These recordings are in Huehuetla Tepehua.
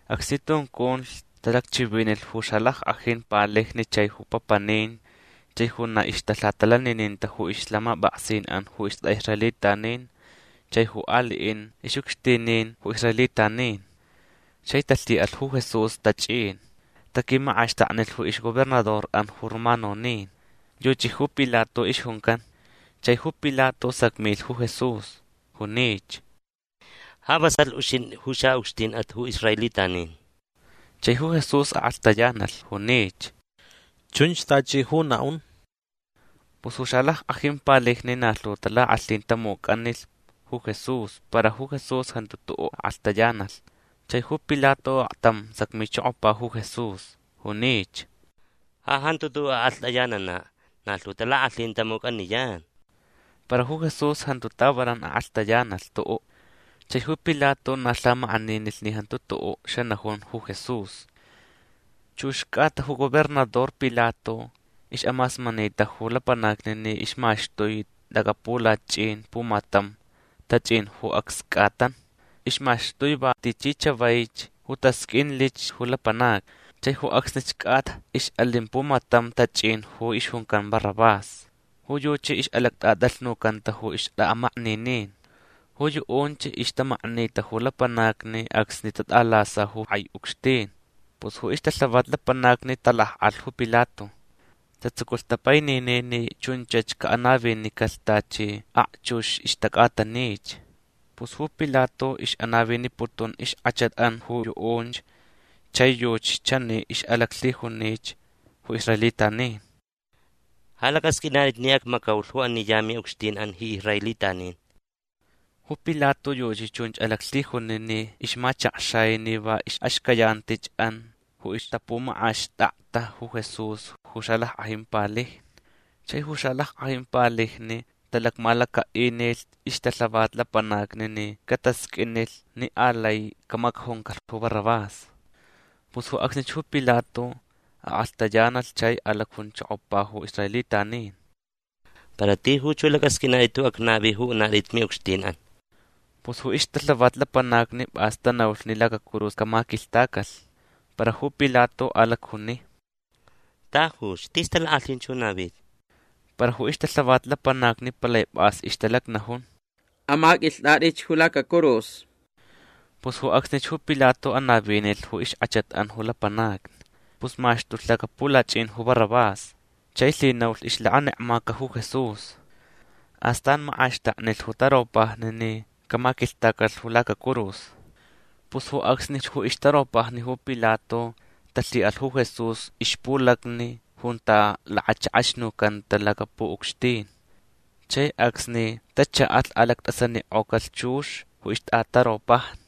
Acsni tunculh talacchivinilh ju xalackʼajin palijni chai ju papanin chai ju na ixtalhatalanininta ju ixlhamapʼaksinʼan ju istʼaʼisraelitanin chai ju aliʼin ixʼucxtinin ju israelitanin. Chai talhiʼalh ju Jesús tachʼin. Taquimakʼaxtaknilh ju ixgobernadorʼan ju romanonin. Yuchi ju Pilato ixjuncan. Chai ju Pilato sacmilh ju Jesús. Junich: ―Ja vasalh uxintʼi ju xaʼucxtinʼat ju israelitanin. Chai ju Jesús akʼalhtayanalh. Junich: ―Chunch tachi ju naʼun. Pus ju xalackʼajin palijni na lhu talakʼalhin tamucʼanilh ju Jesús para ju Jesús jantu tuʼuʼ akʼalhtayanalh. Chai ju Pilato aktam sacmichokopa ju Jesús. Junich: ―Ja jantu tuʼuʼ akʼalhtʼayananaʼ. Na lhu talakʼalhin tamucʼaniyan. Para ju Jesús jantu tavanan akʼalhtayanalh tuʼuʼ. Chai ju Pilato na lhamakʼaninilh ni jantu tuʼuʼ xanajun ju Jesús. Chux cʼata ju gobernador Pilato ixʼamasmanita ju lapanacni ni ixmaxtui lacapulachʼin pumatam tachʼin ju acs cʼatan. Ixmaxtui va tichi chavaich ju tasqʼuinlich ju lapanacni. Chai ju acsnich cʼata ixʼalin pumatam tachʼin ju ixjuncan Barrabás. Ju yuchi ixʼalactʼatʼalhnucanta ju ixtʼaʼamakninin. Ju yuʼunch ixtamaknita ju lapanacni acsni tatʼalasalh ju kʼai ucxtin. Pus ju ixtalhavat lapanacni talakʼalh ju Pilato. Tatsuculh tapaininin ni chunchach caʼanavinicalh tachi akchux ixtacʼatanich. Pus ju Pilato ixʼanaviniputun ixkʼachatʼan ju yuʼunch chai yuchi chani alaclhijunich ju israelitanin: ―Ja lacʼasqʼuinatʼit ni acmacaulh ju ani ya miʼucxtinʼan ji israelitanin. Ju Pilato yuchi chunch alaclhijuni ni ixmachakxai ni va ixʼaxcayantichʼan ju ixtapumakʼaxtakta ju Jesús ju xalackʼajin palijni. Chai ju xalackʼajin palijni talacmalacaʼinilh ixtalhavat lapanacni ni catasqʼuinlh ni alai camacajuncalh ju Barrabás. Pus ju acsnich ju Pilato akʼalhtayanalh chai alacjunchokopa ju israelitanin: ―Para tijuch ju lacʼasqʼuinatʼit ju acnavi ju unatʼit miʼucxtinʼan. Pus ju ixtalhavat lapanacni pʼas tanaulh ni lacacurus camaquilhtacalh. Para ju Pilato alacjuni: ―Tajuch. Tis talakʼalhin ju navita. Para ju ixtalhavat lapanacni palai pʼas ixtalacnajun: ―Amaqʼuilhtʼatʼich ju lacacurus. Pus ju acsnich ju Pilato anavinilh ju ixkʼachatʼan ju lapanacni. Pus maxtulh lacapulachʼin ju Barrabás. Chai lhinaulh ixlakanekmaca ju Jesús. Astan makʼaxtaknilh ju taropajni ni camaquilhtacalh ju lacacurus. Pus ju acsnich ju ixtaropajni ju Pilato talhiʼalh ju Jesús ixpulacni junta lakachakʼaxnucanta lacapuʼucxtin. Chai acsni tachaʼalh alactʼasanikʼocalh chux ju ixtʼataropajni.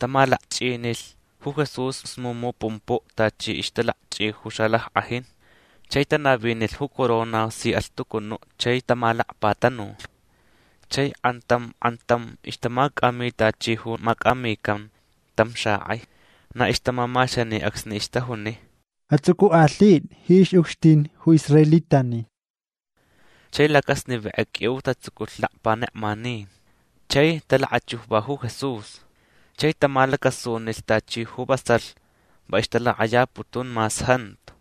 Tamalakchʼinilh ju Jesús smumu pumpuʼ tachi ixtalakchʼi ju xalackʼajin. Chai tanavinilh ju corona si alhtucunuʼ chai tamalacpatanulh. Chai kʼantam kʼantam ixtamacʼami tachi ju macʼamican tam xakʼai. Na ixtamamaxani acsni ixtajuni: ―Atsʼucʼukʼalhitʼi ji ixʼucxtin ju israelitanin. Chai lacasnivenkʼe qʼuiu tatsuculh lakpanekmanin. Chai talakachujva ju Jesús. Chai tamalacasunilh tachi ju vasalh va ixtalakʼayaputun mas jantu.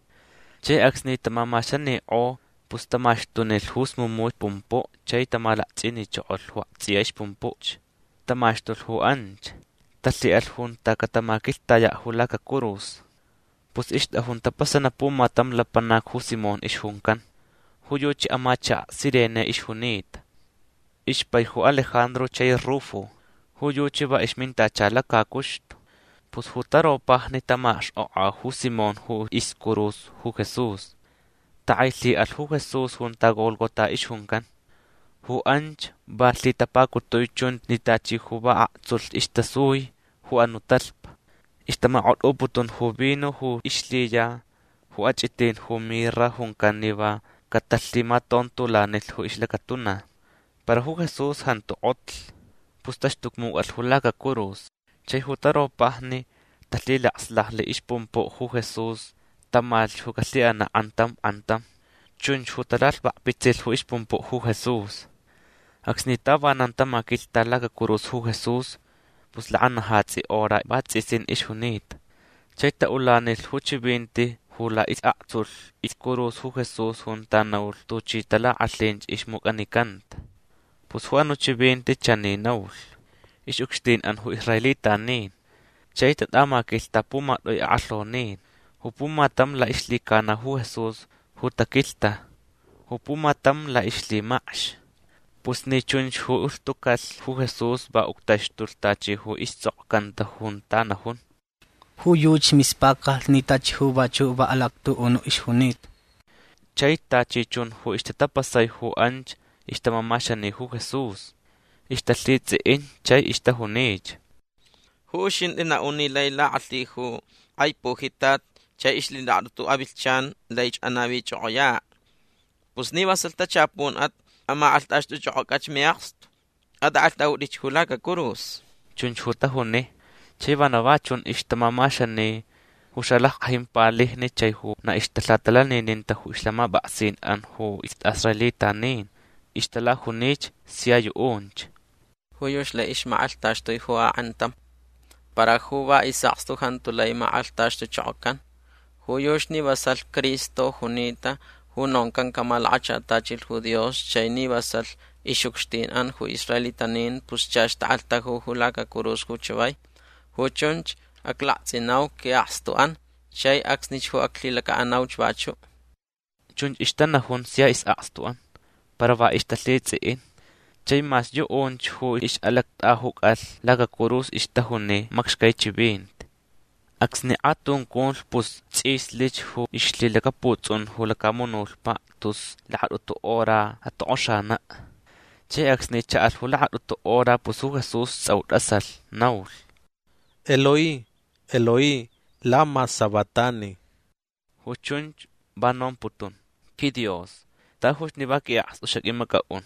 Chai acsni tamamaxanikʼo pus tamaxtunilh ju smumu pumpuʼ chai tamalakchʼinichokolh ju aktsʼiya ixpumpuch. Tamaxtulh ju anch. Talhiʼalh junta catamaquilhtayaʼ ju lacacurus. Pus ixtʼajun tapasanaʼ pumatam lapanac ju Simón ixjuncan. Ju yuchi amachakaʼ Cirene ixjunita. Ixpai ju Alejandro chai Rufo. Ju yuchi va ixmintacha lacacuxtu. Pus ju taropajni tamakxkʼokʼa ju Simón ju iscurus ju Jesús. Takʼailhiʼalh ju Jesús junta Gólgota ixjuncan. Ju anch va lhitapacutui chunch ni tachi ju va aktsulh istasui ju anuʼ talhpa. Ixtamakʼotʼuputun ju vino ju ixlhiya ju achʼitin ju mirra juncan ni va catalhimatontolanilh ju ixlacatuna. Para ju Jesús jantu kʼotlh. Pus taxtucmucʼalh ju lacacurus. Chai ju taropajni talhilaslajlh ixpumpuʼ ju Jesús tamalhch ju calhiʼanaʼ kʼantam kʼantam. Chunch ju talalhvakpitsilh ju ixpumpuʼ ju Jesús. Acsni tavanan tamaquilhta lacacurus ju Jesús pus lakanajatsi hora vatsʼisin ixjunita. Chai taʼulanilh ju chivinti ju laʼisʼaktsulh iscurus ju Jesús junta naulh tuchi talakʼalhin ixmucʼanicanta. Pus ju anuʼ chivinti chani naulh: “Ixʼucxtinʼan ju israelitanin”. Chai tatʼamaquilhta pumatʼui akʼalhonin. Ju pumatam laʼixlhicana ju Jesús ju taquilhta. Ju pumatam laʼixlhimacx. Pus ni chunch ju ulhtucalh ju Jesús va uctaxtulh tachi ju istsʼokcanta junta najun: “Ju yuchi mispacalh ni tachi ju vachuʼ va alactuʼunuʼ ixjunita”. Chai tachi chun ju ixtatapasai ju anch ixtamamaxani ju Jesús. Ixtalhitsʼiʼin chai ixtajunich: ―Ju uxintʼi naʼun ni lai lakʼalhi ju kʼai pujitat chai ixlhilakatʼutu avilhchan laich anavichʼokʼoyaʼ. Pus ni vasalh tachapunʼat amakʼalhtʼaxtʼuchʼokʼocʼach miʼakstu. Atʼakʼalhtʼaʼutʼich ju lacacurus. ―Chunch ju tajuni. Chai vana va chun ixtamamaxani ju xalackʼajin palijni chai ju na ixtalhatalanininta ju ixlhamapʼaksinʼan ju istʼaʼisraelitanin. Ixtalajunich sia yuʼunch: ―Ju yuchi lai ixmakʼalhtaxtui ju akʼantam. Para ju va isʼakstu jantu lai makʼalhtaxtuchokocan. Ju yuchi ni vasalh Cristo junita ju noncan camalakachatachilh ju Dios chai ni vasalh ixʼucxtinʼan ju israelitanin pus chach takʼalhtaju ju lacacurus ju chavai. Ju chunch aclaktsʼinau quiʼakstuʼan chai acsnich ju aclhilacaʼanauch vachuʼ. Chunch ixtanajun sia isʼakstuʼan. Para va ixtalhitsʼiʼin. Chai mas yuʼunch ju ixʼalactʼajucalh lacacurus ixtajuni macxcai chivinti. Acsni kʼatunculh pus tsʼislich ju ixlhilacaputsʼun ju lacamunutpaʼ tus lakatʼutu hora atokʼoxanaʼ. Chai acsni chaʼalh ju lakatʼutu hora pus ju Jesús tsʼau tʼasalh. Naulh: ―Eloi, Eloi, lama sabactani. Ju chunch va nomputun: QuiDios. Tajuch ni va quiʼakstu xaqʼuimacʼaʼun.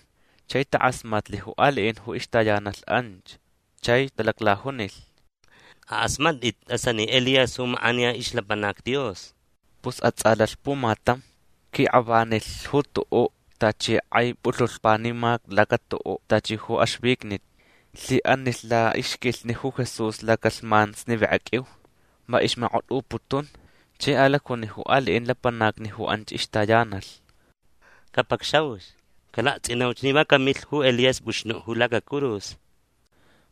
Chai takʼasmatlh ju aliʼin ju ixtayanalh anch. Chai talaclajunilh: ―Akʼasmatʼit. Tʼasani Elías ju makʼaniya ixlapanac Dios. Pus atsʼalalh pumatam. Quikʼavanilh ju tuʼuʼ tachi kʼai pulhulh panimac laca tuʼuʼ tachi ju axvicnit. Lhiʼanilh laʼixquilhni ju Jesús lacalhman snivenkʼa qʼuiu. Va ixmakʼotʼuputunch. Chai alacjuni ju aliʼin lapanacni ju anch ixtayanalh: ―Capacxauch. Calaktsʼinauch ni va camilh ju Elías pʼuxnuʼ ju lacacurus.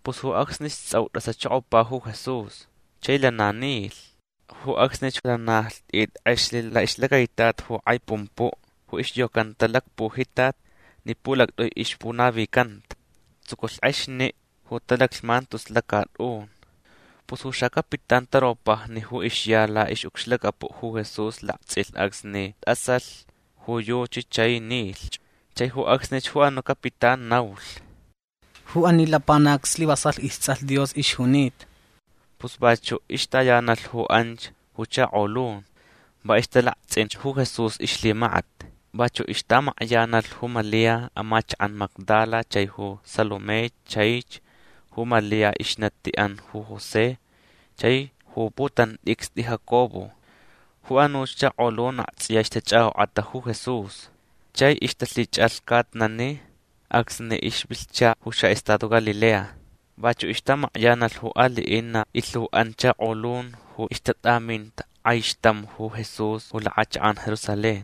Pus ju acsnich tsʼau tʼasachokopa ju Jesús. Chai lana nilh. Ju acsnich lana lhtʼit kʼexlh laʼixlacaitat ju kʼai pumpuʼ ju ixyocanta lacpujitat ni pulactʼui ixpunavicanta. Tsuculh kʼexniʼ ju talaclhman tus lacatʼun. Pus ju xacapitán taropajni ju ixya laʼixʼucxlacapuʼ ju Jesús laktsʼilh acsni tʼasalh ju yuchi chai nilhch. Chai ju acsnich ju anuʼ capitán naulh: ―Ju ani lapanac slivasalh istsʼalh Dios ixjunita. Pus vachuʼ ixtayanalh ju anch ju chakolun. Va ixtalaktsʼinch ju Jesús ixlhimakat. Vachuʼ ixtamakyanalh ju Malia amachakaʼ Magdala chai ju Salomé chaich ju Malia ixnatiʼan ju José chai ju putantʼicstʼi Jacobo. Ju anuch chakolun aktsʼiya ixtachʼakʼokʼata ju Jesús. Chai ixtalhichʼalhcatnani acsni ixvilhcha ju xaʼestado Galilea. Vachuʼ ixtamakyanalh ju aliʼin na ilhuʼan chakolun ju ixtatʼaminta kʼaixtam ju Jesús ju lakʼachakʼan Jerusalén.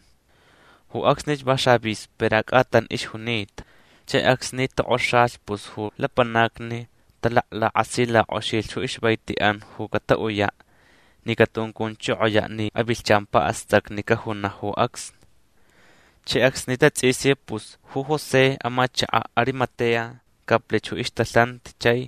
Ju acsnich va xavísperas cʼatan ixjunita. Chai acsni tokʼoxalh pus ju lapanacni talaklakasilackʼoxilh ju ixvaitiʼan ju cataʼuyaʼ ni catuncunchokoyaʼ ni avilhchan paʼastacni cajunaʼ ju acsni. Chai acsni tatsʼisi pus ju José amachakaʼ Arimatea caplich ju ixtalhanti chai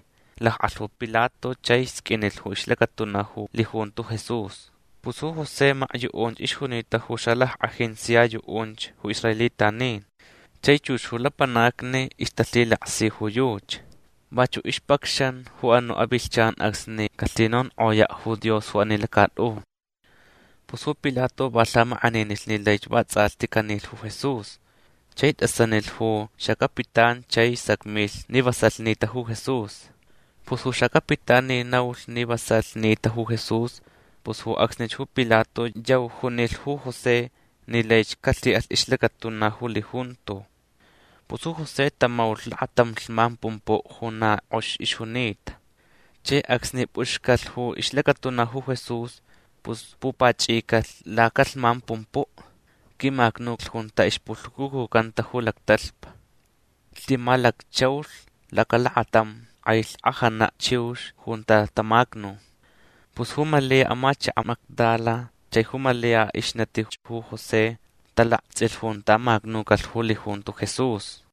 lakʼalh ju Pilato chai sqʼuinlh ju ixlacatuna ju lijunto Jesús. Pus ju José makyuʼunch ixjunita ju xalackʼajin sia yuʼunch ju israelitanin. Chai chux ju lapanacni ixtalhilaksi ju yuchi. Vachuʼ ixpacxan ju anuʼ avilhchan acsni calhinonkʼoyaʼ ju Dios ju ani lacatʼun. Pus ju Pilato va lhamakʼaninilh ni laich vatsʼalhti canilh ju Jesús. Chai tʼasanilh ju xacapitán chai sacmilh ni vasalh nita ju Jesús. Pus ju xacapitán ni naulh ni vasalh nita ju Jesús pus ju acsnich ju Pilato yau junilh ju José ni laich calhiʼalh ixlacatuna ju lijunto. Pus ju José tamaulh lakatam lhman pumpuʼ ju na kʼox ixjunita. Chai acsni pʼuxcalh ju ixlacatuna ju Jesús pus pupachʼicalh lacalhman pumpuʼ. Quimacnulh junta ixpulhucucucanta ju lactalhpa. Lhimalacchʼaulh lacalakatam kʼai lhkʼajana chiux junta tamacnu. Pus ju Malia amachakaʼ Magdala chai ju Malia ixnatich ju José talaktsʼilh junta macnucalh ju lijunto Jesús.